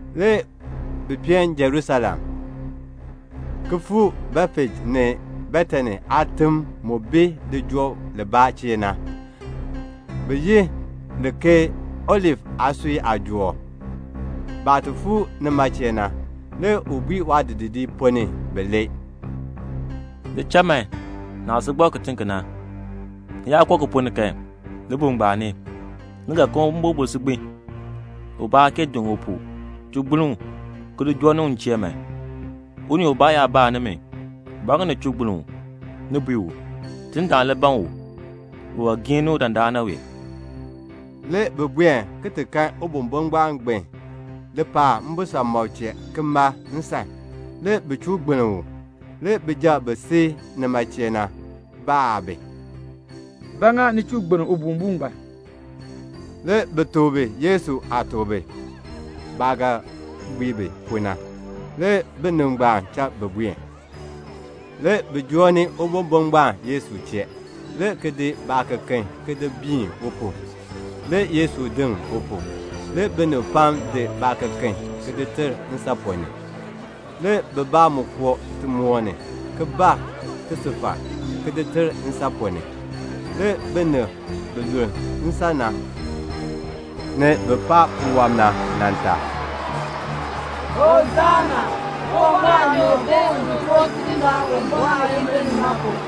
Le bi peen Jerusalem, le ki fuu Betfej ni Betani aatim, mu bi lijool libaa chee na, bi yi li ke Olif aasui aajool. Baah ti fuu nima chee na, le u bui waadidiliib ponn ni bilee, "Li cha man naah si gbak kitiŋ ki na. Ni yaa koo ki ponn ni kan, libuul ngbaan ni, ni ga kan ubombo si gbin. Ubaa aa kee diŋ u pu. Chuu gbiln u, ki li joo ni u m chee man. Unii ubaa yaa baa nimi, 'Ba ŋa ni chuu gbiln u?' ni bui u, 'Tidindaan le ban u. U ga giin ni u dandana wee."' Le bi buen ti kan ubombo ngbaan gbin lipaal mbisamɔb chee ki mal nsan. Le bi chuu gbiln u. Le binib bi si nima chee na bibaa baa bi, "Ba ŋa ni chuu gbiln ubombo ngbaan?" Le bi tuk bi Yesu aah tuk bi baah ga bui bi pu na. Le binib ngbaan cha bi buen. Le bi joo ni ubombo ngbaan Yesu chee, le ki di baakeken ki di biin u pu. Le Yesu diŋ u pu. Le binib pam di baakeken ki di ter nsan ponn ni. Le bibaa mu koo timoor ni, ki bar tisufar ki di ter nsan ponn ni. Le binib bi luln nsan na, ni bin paan puwɔb na nan tar, "Hosana, Uwumbɔr aanyoor bi un choo Tidindaan Uwumbɔr aayimbil ni na pu.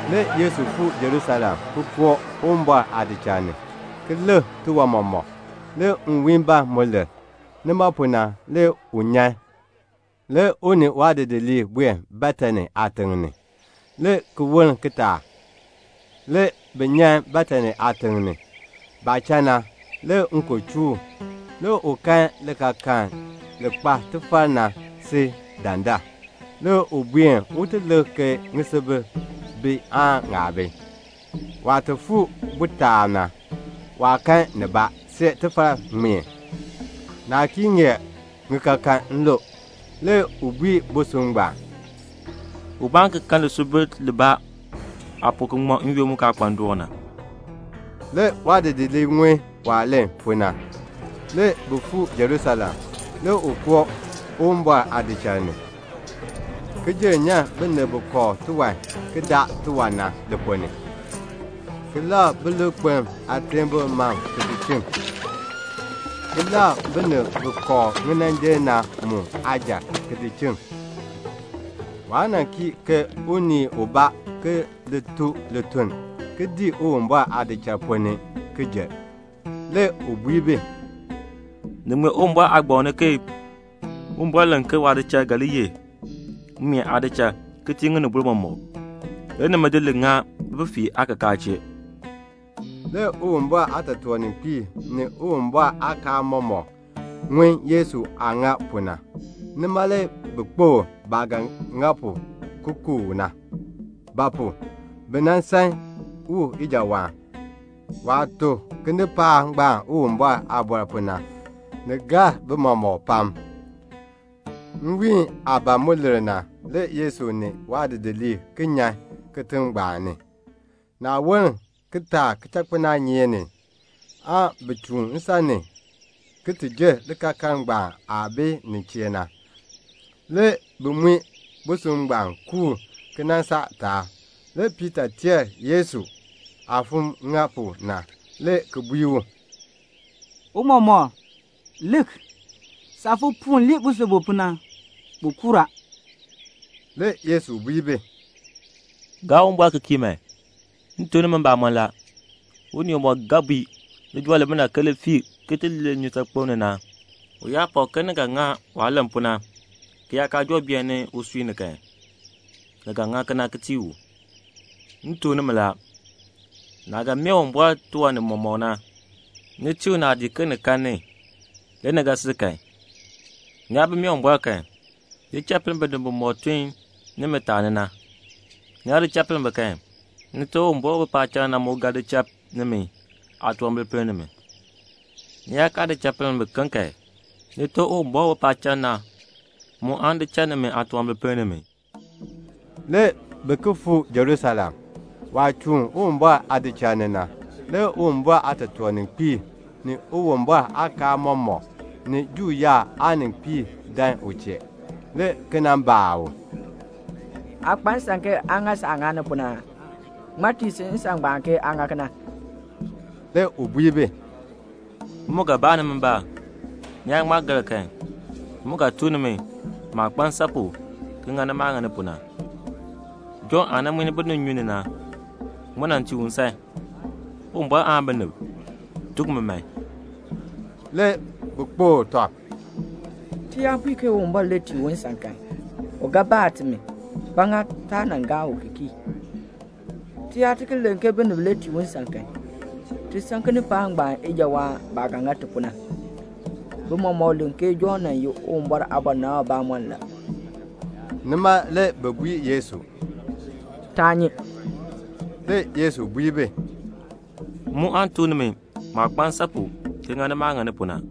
Le Yesu fuu Jerusalem, le ki koo Uwumbɔr aadichal ni, ki lik tiwan mɔmɔk. Le nwiin ban mu lir. Nima pu na le u nyan, le u ni waadidiliib buen Betani aatiŋ ni. Le ki woln kitaak, le bi nyan Betani aatiŋ ni. Baah cha na, le nkon joo u. Le u kan likaakaln li kpa tifar na si dandar. Le u buen un ti lik ke ŋisubil bi aan ŋaa bi. Waah fuu ni bu taab na, waa kan nibaa see tifar ŋmeen. Naa kee ŋeer ŋikaakan lu. Le u bui busub ngbaan, "Ubaa aan ki kan lisubil libaa aa pu ki ŋmɔ n-yoonn mu kaa kpa ndoon na." Le waadidiliib ŋun waah len pu na. Le bi fuu Jerusalem. Le u koo Uwumbɔr aadichal ni, le ki jenn nyan binib bi kooh tiwan ki daa tiwan na li ponn ni, ki labr bilikpelm aateebl mam ki di chiŋ, ki labr binib bi kooh ŋinanjil na mu aajal ki di chiŋ. Waa cha unii ubaa tun tiwan ki dii jer Uwumbɔr aadichal ponn ni. Le u bui bi, "Ni ŋmee Uwumbɔr aagbaŋ ni ke Uwumbɔr len ke waadichal ga li ye mmeen aadichal ki tii ŋinibol mɔmɔk; nimi le ŋa li bififiirb aakakaa chee." Le Uwumbɔr aatotoorninkpiib, ni Uwumbɔr aakaal aamɔmɔkb ŋun Yesu aah ŋa pu na. Nima le bi kpokl baah ga ŋa pu ki ku u na; ba pu? bi san u ijawaan. Waah tuk kinipaak ngbaan Uwumbɔr aaliin na, ni gar bi mɔmɔk pam. Nwiin aah ban mu lir na, le Yesu ni waadidiliib ki nyan kitiŋ ngbaan ni. Le ki woln kitaak kichakpinaanyeek ni, le bi chuun nsan ni ki jer likaakaln ngbaan aah bi nin chee na, le ki mui busub ngbaan kuur ki nan saa taab. Le Piita teer Yesu aah fon ŋa pu na, le ki bui u, "Tiicha, lik, saah fon puun lii busub bu pu na, bu kuur a." Le Yesu bui bi, "Gaa Uwumbɔr ki kii man. M tuk nimi mbamɔn la, unii umɔk ga bui lijool limina ke li fii ki lir nnyusaakpem ni na, u yaa pak ke ni ga ŋa waah len pu na, ki yaa kaa joo beeni usui ni kan, ni ga ŋa kena ki tii u. M tuk nimi la, naah ga mee Uwumbɔr tiwan nimɔk na, tii u naadii man ke ni kan, le ni ga sil kan. Ni yaa bi mee Uwumbɔr kan, di cha pinn binib bimɔk tun nimi taani na. Ni yaa di cha pinn bi kan, Nite Uwumbɔr u bi paacham na, mu ga di cha nimi aatunwambir pinn nimi. [ Ni yaa kaa di cha pinn biken kan, Nite Uwumbɔr u bi paacham na, mu aan di cha nimi aatunwambir pinn nimi.]" Le bi ki fuu Jerusalem. Waah chuun Uwumbɔr aadichal ni na, le Uwumbɔr aatotoorninkpiib, ni Uwumbɔr aakaal aamɔmɔkb, ni Juu yaab aaninkpiib, dan u chee, le ki nan baa u, "Aa kpa nsan ke aa ŋa saah ŋani pu na aa? Ŋmaa tii si nsan ngbaan ke aa ŋa kena?" Le u bui bi, "M mu ga baa nimi mbaan. Ni yaa ŋma gar kan, m mu ga tuk nimi maah kpa nsan pu ki ŋa maah ŋani pu na. Jɔnn aah nan muin binib nnyun ni na, ŋmaa tii u nsan? Uwumbɔr aan binib? Tuk mi man." Le bi kpokl tɔb, "Ti yaa bui ke Uwumbɔr le tii u nsan kan, u ga baa timi, ba ŋa taa gaa u ki kii? Ti yaa ki len ke binib le tii u nsan kan, ti san kinipaak ngbaan ijawaan baah ga ŋa timi pu na; bi mɔmɔk len ke Jɔnn nan ye Uwumbɔr aabɔnabamɔnn la." Nima le bi bui Yesu, "Taa nyi." Le Yesu bui bi, "M mu aan tuk nimi maah kpa nsan pu ki ŋani maah ŋani pu na."